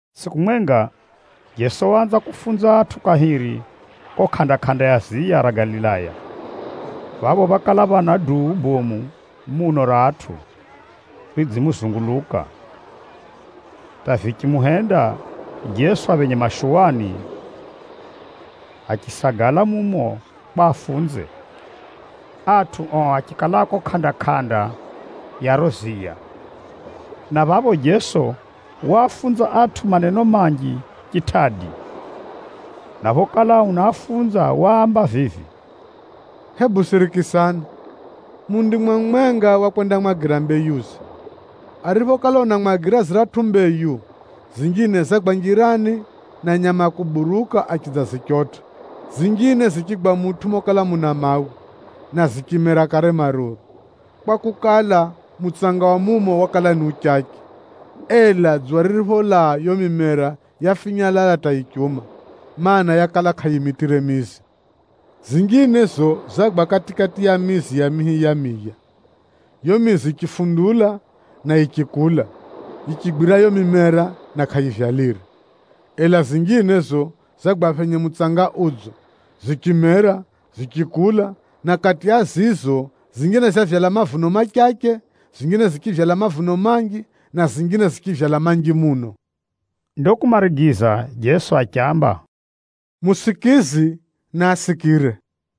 Tsʼiku mwenga, Jeso waanza kufunza atʼu kahiri kuko kʼanda-kʼanda ya ziya ra Galilaya. Phapho phákala phana duu bomu muno ra atʼu ridzimuzunguluka, hata vichimuhenda Jeso aphenye mashuwani achisagala mumo kwa afunze. Atʼu ao achikala kuko kʼanda-kʼanda ya riro ziya. Na phapho Jeso waafunza atʼu maneno manji chitʼadi, na phokala unaafunza waamba vivi, “Hebu sirikisani! Mundimwa mumwenga wakwendamwagira mbeyuze. Ariphokala unamwagira ziratʼu mbeyu, zinjine zagwa njirani, na nyama a kuburuka achidzazichotʼa. Zinjine zichigwa mutʼu mokala muna mawe, na zichimera kare maruru, kwakukala, mutsanga wa mumo wakala ni uchache. Ela dzuwa riripholaa, yiyo mimera yafinyalala hata yichiuma, mana, yakala kʼayimitʼire mizi. Zinjine za zizo zagwa kati-kati ya mizi ya mihi ya miya. Yiyo mizi yichifundula na yichikula, yichigwira yiyo mimera, na kʼayivyalire. Ela zinjine za zizo, zagwa phenye mutsanga udzo, zichimera, zichikula, na kati ya zizo, zinjine zavyala mavuno machache, zinjine zichivyala mavuno manji, na zinjine zichivyala manji muno.” Ndo kumarigiza Jeso achiamba, “Musikizi, naasikire!”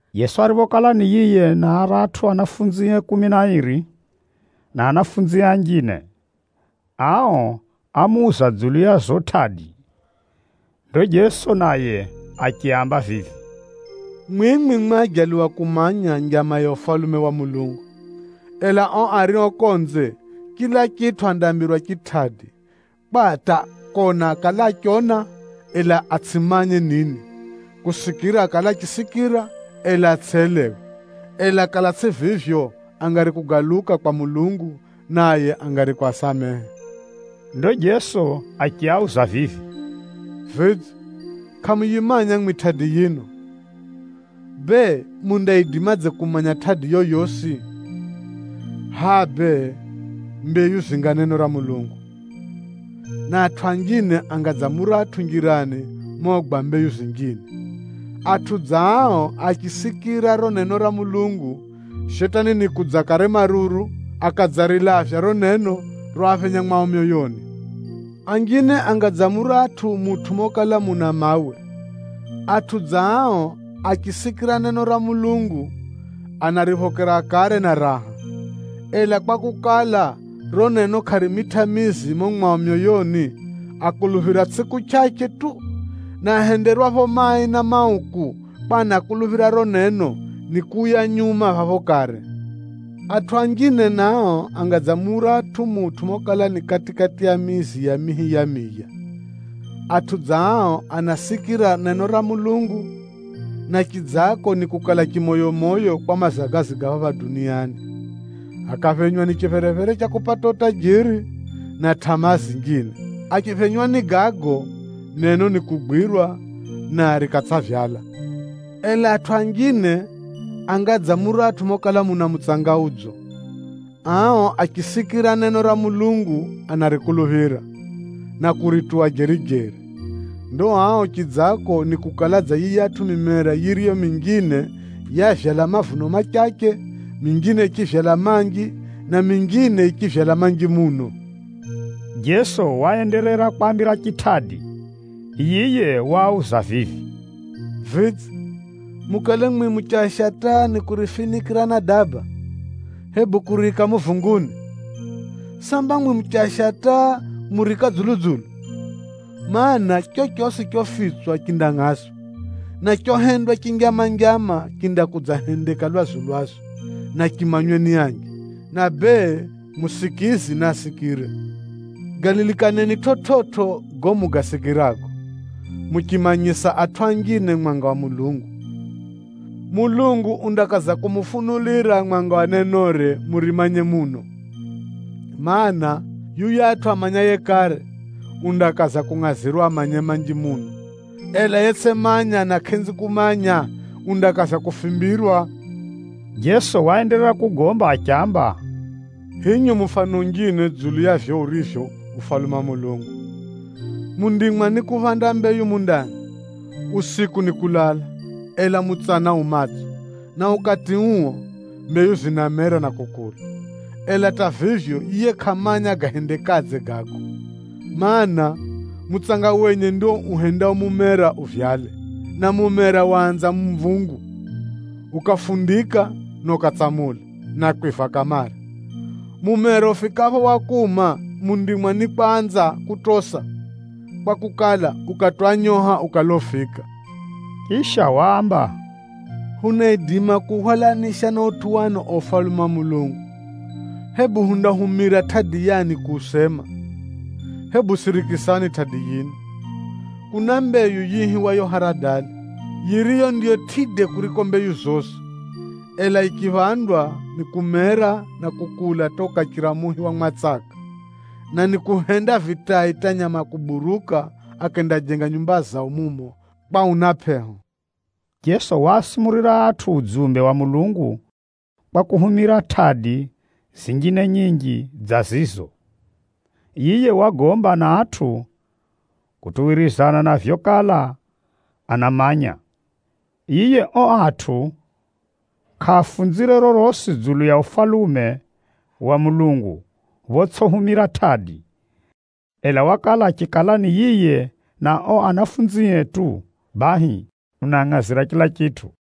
Jeso ariphokala ni yiye na aratʼu anafunzie kumi na airi, na anafunzie anjine, ao ámuuza dzulu ya zizo tʼadi. Ndo Jeso naye achiaamba vivi, “Mwimwi mwajaliwa kumanya njama za Ufalume wa Mulungu. Ela ao ario konze, chila chitʼu andaambirwa chitʼadi, kwa hata ‘Kona akale achiona, ela atsʼimanye nini. Kusikira akale achisikira, ela atsʼelewe. Ela kakala tsʼi vivyo, angari kugaluka kwa Mulungu, naye angari kwasamehe.’” Ndo Jeso achiauza vivi, “Vidze, kʼamuyimanya mwimwi tʼadi yino? Bee, mundaidimadze kumanya tʼadi yoyosi? Hʼa bee, mbeyu zinga neno ra Mulungu, na atʼu anjine anga dza muratʼu njirani mogwa mbeyu zinjine. Atʼu dza ao achisikira riro neno ra Mulungu, Shetani nikudza kare maruru, akadzarilavya riro neno roaphenya mwao myoyoni. Anjine anga dza muratʼu mutʼu mokala muna mawe. Atʼu dza ao achisikira neno ra Mulungu, anariphokera kare na raha. Ela kwakukala, riro neno kʼarimitʼa mizi mumo mwao myoyoni, akuluphira tsʼiku chʼachʼe tu, na ahenderwapho mai na mauku kwa anakuluphira riro neno, nikuuya nyuma phapho kare. Atʼu anjine nao, anga dza muratʼu mutʼu mokala ni kati-kati ya mizi ya mihi ya miya. Atʼu dza ao anasikira neno ra Mulungu, na chidzako nikukala chimoyomoyo kwa mazagazi ga phapha duniani, akaphenywa ni chipherephere cha kupata utajiri, na tʼamaa zinjine. Achiphenywa ni gago, neno nikugwirwa, na rikatsʼavyala. Ela atʼu anjine anga dza muratʼu mokala muna mutsanga udzo. Ao achisikira neno ra Mulungu anarikuluphira, na kurituwa jeri-jeri. Ndo ao chidzako nikukala dza yiyatʼu mimera yiriyo minjine yavyala mavuno machache, minjine yichivyala manji, na minjine yichivyala manji muno.” Jeso waenderera kwaambira chitʼadi. Yiye waauza vivi, “Vidze, mukale mwimwi muchasha taa nikurifinikʼira na daba, hebu kuriika muvunguni? Samba mwimwi muchasha taa, muriika dzulu-dzulu? Maana, chochosi chofitswa chindamanyikana, na chohendwa chinjama-njama, chindakudzahendeka lwazu-lwazu, na chimanywe ni anji. Na bee, musikizi, naasikire! Galilikaneni chividzo gago mugasikirago. Muchimanyisa atʼu anjine mwanga wa Mulungu, Mulungu undakaza kumufunulira mwanga wa nenore murimanye muno. Maana, yuyatʼu amanyaye kare, undakaza kungʼazirwa amanye manji muno, ela yetsʼimanya na kʼenzi kumanya, undakaza kufimbirwa.” Jeso waenderera kugomba achiamba, “Hinyu mufano unjine dzulu ya vivyo urivyo uo Ufalume wa Mulungu. Mundimwa nikuphanda mbeyu mundani. Usiku nikulala, ela mutsana yu matso, na ukati uo, mbeyu zinamera na kukula. Ela hata vivyo, yiye kʼamanya gahendekadze gago, mana, mutsanga wenye ndio uhendao mumera uvyale. Na mumera waanza mvungu, ukafundika na ukatsamula, na kwiva kamare. Mumera ufikapho wa kuuma, mundimwa nikwanza kutosa, kwakukala, ukati wa nyoha ukala ufika.” Chisha waamba, “Hunaidima kuuhwalanisha na utʼu wani uo Ufalume wa Mulungu? Hebu hundahumira tʼadi yani kuusema? Hebu sirikisani tʼadi yino. Kuna mbeyu yiihiwayo haradali, yiriyo ndiyo tʼide kuriko mbeyu zosi. Ela yichiphandwa, nikumera na kukula hata ukachira muhi wa mwatsaka, na nikuhenda vitai hata nyama a kuburuka, akendajenga nyumba zao mumo kwa una pʼeho.” Jeso waasumurira atʼu udzumbe wa Mulungu kwa kuhumira tʼadi zinjine nyinji dza zizo. Yiye wagomba na atʼu kutuwirizana na vyokala anamanya. Yiye ao atʼu kʼaafunzire rorosi dzulu ya Ufalume wa Mulungu photsʼihumira tʼadi. Ela wakala achikala ni yiye na ao anafunzie tu bahi, unaangʼazira chila chitʼu.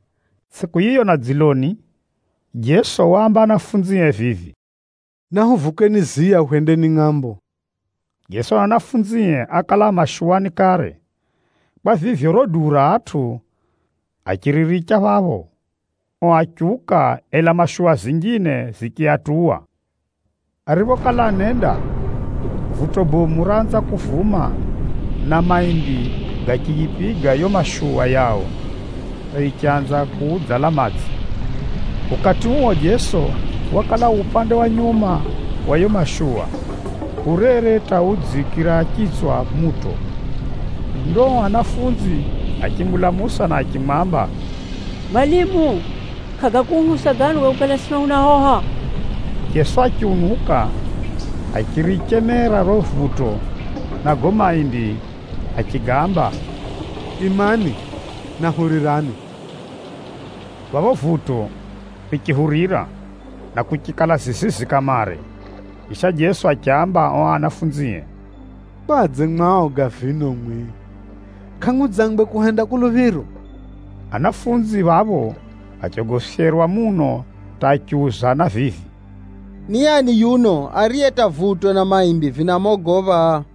Tsʼiku yiyo na dziloni, Jeso waamba anafunzie vivi, “Nahuvukeni ziya hwendeni ngʼambo ya phiri.” Jeso na anafunzie ákala a mashuwani kare. Kwa vivyo, riro duu ra atʼu achiriricha phapho, ao achiuka, ela mashuwa zinjine zichiatuwa. Ariphokala anenda, vuto bomu raanza kuvuma, na maimbi gachiyipiga yiyo mashuwa yao hata yichanza kuphenya madzi. Ukati uo Jeso wakala u upande wa nyuma wa yiyo mashuwa, urere hata udziikira chitswa muto. Ndo ao anafunzi achimulamusa na kuno anamwamba, “Mwalimu, kʼagakuuhusa gano ga kukala, sino hunahoha?” Jeso achiunuka, achirichemera riro vuto na gago maimbi achigaamba, “Imani! Na hurirani!” Phapho vuto richihurira, na kuchikala zizizi kamare. Chisha Jeso achiaamba ao anafunzie, “Kwadze mu aoga vino mwimwi? Kʼamudzangwe kuhenda kuluphiro?” Anafunzi phapho achogofyerwa muno hata achiuzana vivi, “Ni ani yuno, ariye hata vuto na maimbi vinamogopha?”